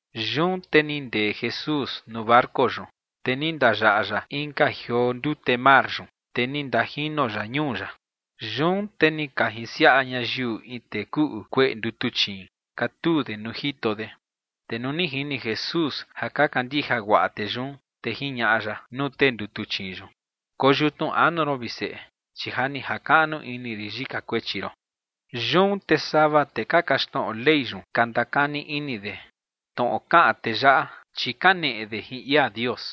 Yun te ni ndee Jesús nuu barco yun, te ni ndayaꞌa ya inka jioo ndute mar yun, te ni ndajino ya ñuu ya. Yun te ni ka jinsiaꞌa ñayiu in tee kuꞌu kueꞌe ndutuchiin, katuu de nuu jito de. Te nuu ni jini Jesús ja ka kandija guaꞌa tee yun, te jiñaꞌa ya nuu tee ndutuchiin yun: ͏―͏Koyutnu anu ron, vi Seꞌe, chi ja ni jakaꞌnu ini rin yika kuechi ron. Yun te sava tee ka kaxtnoꞌo Ley yun ka ndakani ini de: “Tnoꞌo kaꞌan tee yaꞌa, chi kaneꞌe de jin ia Dios”.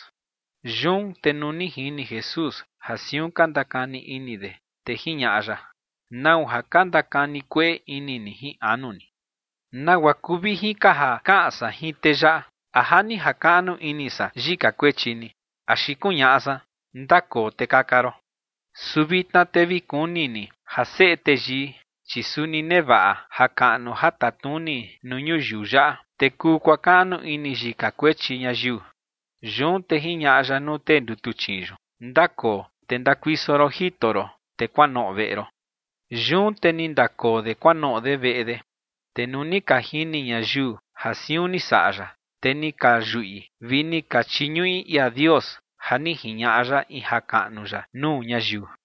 Yun te nuu ni jini Jesús ja siun ka ndakani ini de, te jiñaꞌa ya: ͏―͏¿Nau ja ka ndakani kueꞌe ini ni jin anu ni? ¿Nagua kuu vijin ka ja kaꞌan san jin tee yaꞌa? ¿A “ja ni jakaꞌnu ini san yika kuechi ni”, axi kuñaꞌa san: “Ndakoo, te kaka ron”? Su vitna te vi kuni ni ja Seꞌe Teyii, chi suni nevaꞌa jakaꞌnu ja tatnuni nuu ñuyiu yaꞌa, te kuu kuakaꞌnu ini yika kuechi ñayiu. Yun te jiñaꞌa ya nuu tee ndutuchiin yun: ͏―͏Ndakoo, te ndakuiso ron jito ron, te kuanoꞌo veꞌe ron. Yun te ni ndakoo de kuanoꞌo de veꞌe de. Te nuu ni ka jini ñayiu ja siun ni saꞌa ya, te ni ka yuꞌi, vi ni ka chiñuꞌi ia Dios ja ni jiñaꞌa ya in jakaꞌnu ya nuu ñayiu.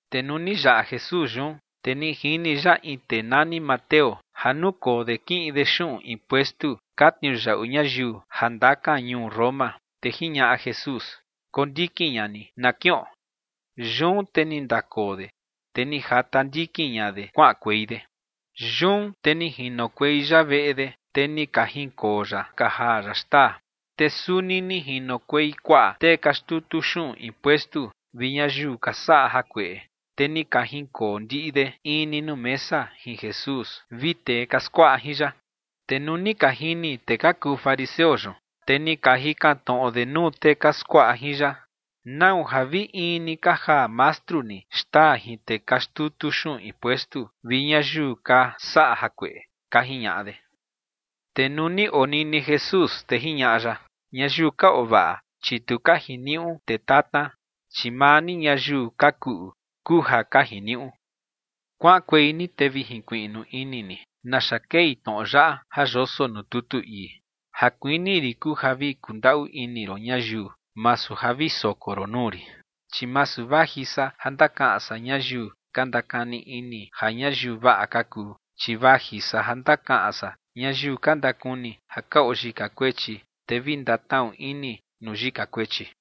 Te nuu ni yaꞌa Jesús yun, te ni jini ya in tee nani Mateo ja nukoo de kiꞌin de xuꞌun impuestu ka tniuyaꞌu ñayiu ja ndakan ñuu Roma, te jiñaꞌa Jesús: ͏―͏Kondikin ña ni na kiꞌon. Yun te ni ndakoo de, te ni jata ndikin ña de kuaꞌankuei de. Yun te ni jinokuei ya veꞌe de, te ni ka jinkoo ya ka jaa ya xtaa. Te suni ni jinokuei kuaꞌa tee ka xtutu xuꞌun impuestu vi ñayiu ka saꞌa jakueꞌe, te ni ka jinkoo ndiꞌi de in ni nuu mesa jin Jesús vi tee ka skuaꞌa jin ya. Te nuu ni ka jini tee ka kuu fariseo yun, te ni ka jikan tnoꞌo de nuu tee ka skuaꞌa jin ya: ͏―͏¿Nau ja vi in ni ka jaa mastru ni xtaa jin tee ka xtutu xuꞌun impuestu vi ñayiu ka saꞌa jakueꞌe? ͏―͏ka jiñaꞌa de. Te nuu ni onini Jesús, te jiñaꞌa ya: ͏―͏Ñayiu ka oo vaꞌa, chi tu ka jiniuꞌu tee tatna, chi maa ni ñayiu ka kuꞌu kuu ja ka jiniuꞌu. Kuaꞌankuei ni te vi jinkuiꞌnu ini ni naxa kei tnoꞌo yaꞌa ja yoso nuu tutu ii: “Ja kuini rin kuu ja vi kundaꞌu ini ron ñayiu, masu ja vi soko ron nuu rin”. Chi masu vaji san ja ndakaꞌan san ñayiu ka ndakani ini ja ñayiu vaꞌa ka kuu, chi vaji san ja ndakaꞌan san ñayiu ka ndakuni ja ka oo yika kuechi, te vi ndatnaꞌu ini nuu yika kuechi.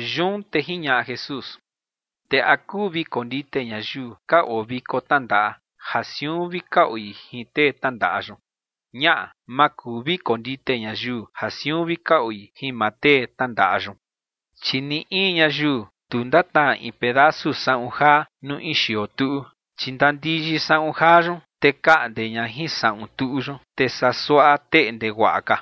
Yun te jiñaꞌa Jesús: ͏―͏Te ¿a kuu vi kondite ñayiu ka oo viko tnandaꞌa ja siun vi ka oi jin tee tnandaꞌa yun? Ñaꞌa, ma kuu vi kondite ñayiu ja siun vi ka oi jin maa tee tnandaꞌa yun. Chi ni in ñayiu tu ndatnaa in pedasu saꞌun jaa nuu in xioo tuꞌu, chi ndandiyi saꞌun jaa yun, te kaꞌnde ña jin saꞌun tuꞌu yun, te saa suaꞌa teꞌnde guaꞌa ka.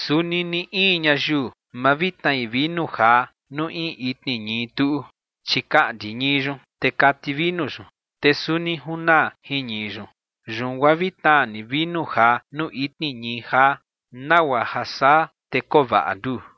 Suni ni in ñayiu ma vi tnai vinu jaa nuu in itni ñii tuꞌu, chi kaꞌndi ñii yun, te kati vinu yun, te suni junaa jin ñii yun. Yun guaa vi tnaa ni vinu jaa nuu itni ñii jaa nagua ja saa te koo vaꞌa nduu.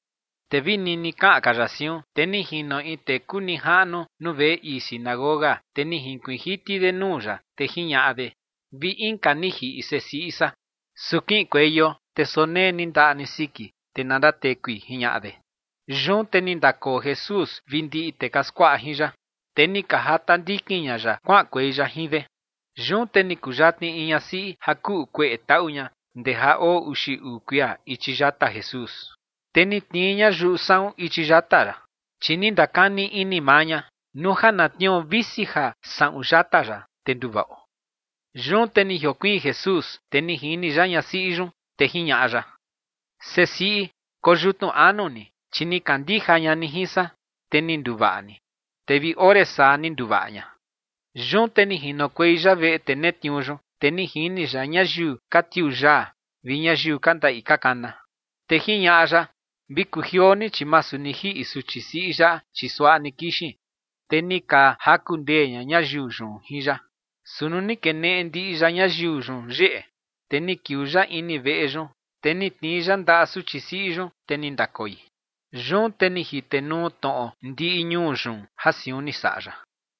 Te vi nini kaꞌan ka ya siun, te ni jino in tee kuu nijaꞌnu nuu veꞌe ii sinagoga, te ni jinkuiin jiti de nuu ya, te jiñaꞌa de: ͏―͏Vi inka ni jiꞌi sesiꞌi san. Su kiꞌinkueio, te sonee ni ndaꞌa ni siki, te na ndatekui ͏―͏jiñaꞌa de. Yun te ni ndakoo Jesús vi ndiꞌi tee ka skuaꞌa jin ya, te ni ka jata ndikin ña ya kuaꞌankuei ya jin de. Yun te ni kuyatni in ñasiꞌi ja kuꞌu kueꞌe taꞌu ña ndee ja oo uxi uu kuia ichi yata Jesús, te ni tnii ña yuꞌu saꞌun ichi yata ya. Chi ni ndakani ini maa ña: “Nuu ja na tnio visi ja saꞌun yata ya, te nduvaꞌo”. Yun te ni jiokuiin Jesús, te ni jini ya ñasiꞌi yun, te jiñaꞌa ya: ͏―͏Sesiꞌi, koyutnu anu ni, chi ni kandija ña ni jin san, te ni nduvaꞌa ni. Te vi ore saa ni nduvaꞌa ña. Yun te ni jinokuei ya veꞌe tee netniuu yun, te ni jini ya ñayiu ka tiuu yaa vi ñayiu ka ndaꞌi ka kana. Te jiñaꞌa ya: ͏―͏Vi kujioo ni, chi masu ni jiꞌi suchi siꞌi yaꞌa, chi suaꞌa ni kixin. Te ni ka jaku ndee ña ñayiu yun jin ya. Su nuu ni keneꞌe ndiꞌi ya ñayiu yun yeꞌe, te ni kiuu ya ini veꞌe yun, te ni tnii ya ndaꞌa suchi siꞌi yun, te ni ndakoi. Yun te ni jitenuu tnoꞌo ndiꞌi ñuu yun ja siun ni saꞌa ya.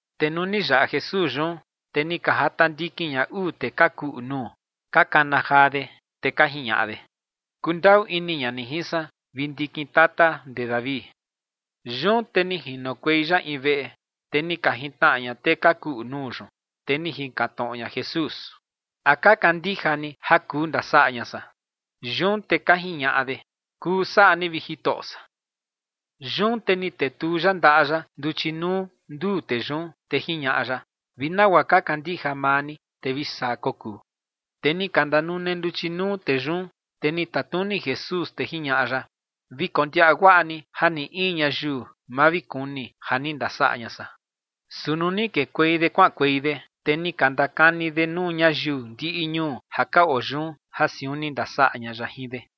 Te nuu ni yaꞌa Jesús yun, te ni ka jata ndikin ña uu tee ka kuꞌu nuu, ka kana jaa de, te ka jiñaꞌa de: ͏―͏Kundaꞌu ini ña ni jin san, vi ndikin tata ndee David. Yun te ni jinokuei ya in veꞌe, te ni ka jintnaꞌa ña tee ka kuꞌu nuu yun, te ni jikan tnoꞌo ña Jesús: ͏―͏¿A ka kandija ni ja kuu ndasaꞌa ña san? Yun te ka jiñaꞌa de: ͏―͏Kuu saꞌa ni, vi Jitoꞌo san. Yun te ni tetuu ya ndaꞌa ya nduchi nuu nduu tee yun, te jiñaꞌa ya: ͏―͏Vi nagua ka kandija maa ni, te vi saa kokuu. Te ni ka ndanune nduchi nuu tee yun, te ni tatnuni Jesús, te jiñaꞌa ya: ͏―͏Vi kondiaꞌa guaꞌa ni ja ni in ñayiu ma vi kuni ja ni ndasaꞌa ña san. Su nuu ni kekuei de kuaꞌankuei de, te ni ka ndakani de nuu ñayiu ndiꞌi ñuu ja ka oo yun ja siun ni ndasaꞌa ña ya jin de.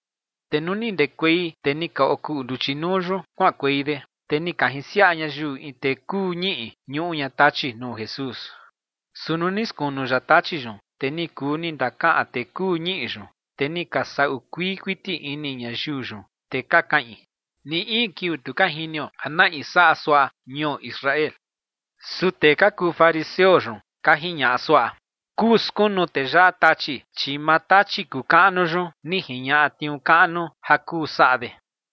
Te nuu ni ndekuei tee ni ka okuꞌu nduchi nuu yun kuaꞌankuei de, te ni ka jinsiaꞌa ñayiu in tee kuu ñiꞌi, ñuꞌu ña tachi, nuu Jesús. Su nuu ni skunu ya tachi yun, te ni kuu ni ndakaꞌan tee kuu ñiꞌi yun. Te ni ka saꞌu kuii kuiti ini ñayiu yun, te ka kaꞌin: ͏―͏¡Ni in kiuu tu ka jinio ja na in saꞌa suaꞌa ñuo Israel! Su tee ka kuu fariseo yun ka jiñaꞌa suaꞌa: ͏―͏Kuu skunu tee yaꞌa tachi, chi maa tachi kuu kaꞌnu yun ni jiñaꞌa tniuu kaꞌnu ja kuu saꞌa de.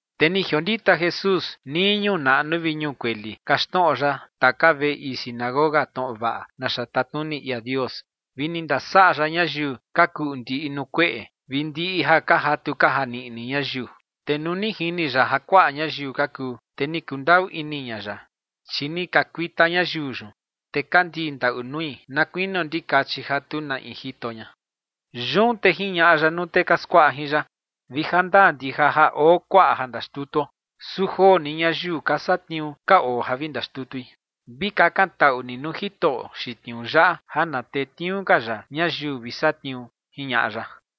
Te ni jiondita Jesús nii ñuu naꞌnu vi ñuu kueli kaxtnoꞌo ya taka veꞌe ii sinagoga tnoꞌo vaꞌa naxa tatnuni ia Dios vi ni ndasaꞌa ya ñayiu ka kuꞌu ndiꞌi nuu kueꞌe vi ndiꞌi ja ka jatu ka janiꞌni ñayiu. Te nuu ni jini ya ja kuaꞌa ñayiu ka kuu, te ni kundaꞌu ini ña ya, chi ni ka kuita ñayiu yun, te ka ndii ndaꞌu nui na kuinio ndikachi ja tu na in jito ña. Yun te jiñaꞌa ya nuu tee ka skuaꞌa jin ya: ͏―͏Vi ja ndaa ndija ja oo kuaꞌa ja ndaxtutuo, su joo ni ñayiu ka satniuu ka oo ja vi ndaxtutui. Vi kakantaꞌu ni nuu Jitoꞌo xiin tniuu yaꞌa ja na tetniuu ka ya ñayiu vi satniuu ͏―͏jiñaꞌa ya.